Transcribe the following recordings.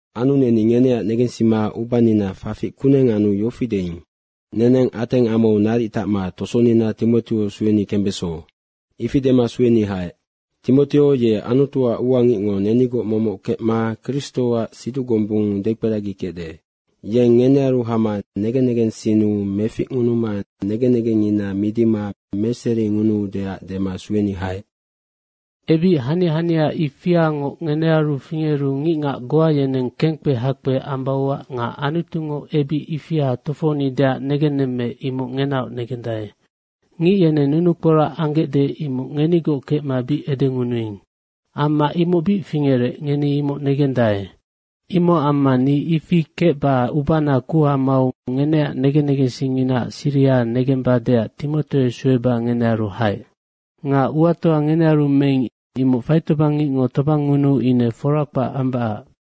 Anu neni ngeneac negensima ubanina fafic kuneng anu yofi deing, “Neneng Ateng amau naric tacma tosonina Timoteo sueni kembeso.” Ifi dema sueni haec. Timoteo ye Anutuac ua ngicngo nenigoc momoc kecma Kristoac siduc gombung dekperagikecde. Yeng ngenearu hama negen negensinnu meficngunuma negen negengngina midima meseringunuudeac dema sueni haec. Ebic hania hania ifiangoc ngenearu fingeru ngicngac goa yeneng kengkpe hakpe ambauac nga Anutungo ebic ifia tofohonideac negennemmeec, imoc ngenaoc negendae. Ngic yeneng nunukporac anggecde, imoc ngenigoc kecma bic edengunuing. Amma imoc bic fingerec, ngeni imoc negendae. Imocac amma ni ifi kecba ubana kuha mau ngeneac negen negensingnginaac siriha negembadeac Timoteo sueba ngenearu haec. Nga uatoa ngenearu meing, imoc faitobang ngicngo tobangngunuu ine fora kpac ambacac.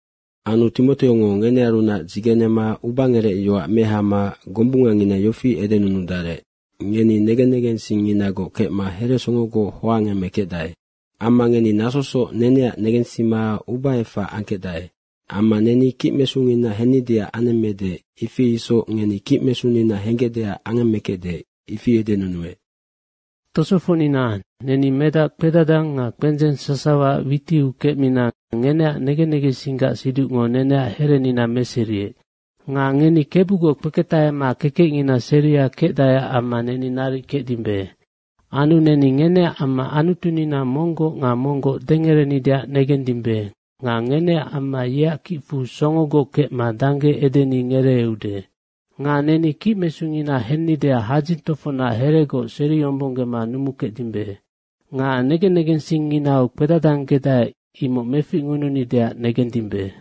Anu Timoteongo ngenearunac dzigenema ubangerec yoac mehama gombungangina yofi edenunudarec, ngeni negen negensingnginagoc kecma heresongogoc hoangemekecdae. Amma ngeni nasosoc neneac negensima ubaefac angkecdae. Amma neni kicmesungina hennideac anemmede, ifi isoc ngeni kicmesunina henggecdeac angemmekecde, ifi edenunuec. Tosofocnina, neni medac kpedadang nga kpendzeng sasawaac witiu kecmina ngeneac negen negensinggac siducngo neneac herenina meseriec. Nga ngeni Kebugoc kpeketahema kekecngina seria kecdaeac amma neni naric kecdimbe. Anu neni ngeneac amma Anutunina monggoc nga monggoc dengerenideac negendimbe nga ngeneac amma yeac kicfu songogoc kecma dangge edeni ngereeude. Nga neni kicmesungina hennideac hadzing tofocnac heregoc seriyombonggema numukecdimbe. Nga negen negensingnginau kapainec kpedadanggedae, imoc meficngununideac negendimbe.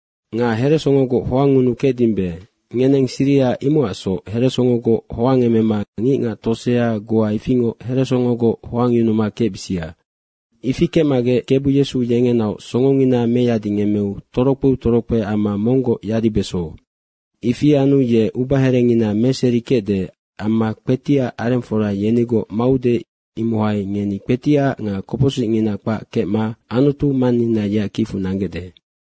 Nga heresongogoc hoangngunukecdimbe, ngeneng siriha imocacsoc heresongogoc hoangemema ngicngac tosea goa ifingoc heresongogoc hoangyunuma kecbisia. Ifi kecmagec Kebu Yesu yengenaoc songongina meyadingemmeu torokpeu torokpe amma monggoc yadibeso. Ifi anu ye ubaherengina meserikecde amma kpetiac arengfora yenigoc maude, imohai ngeni kpetiac nga kopocsicngina kpac kecma Anutu Mannina yeac kicfu nanggecde.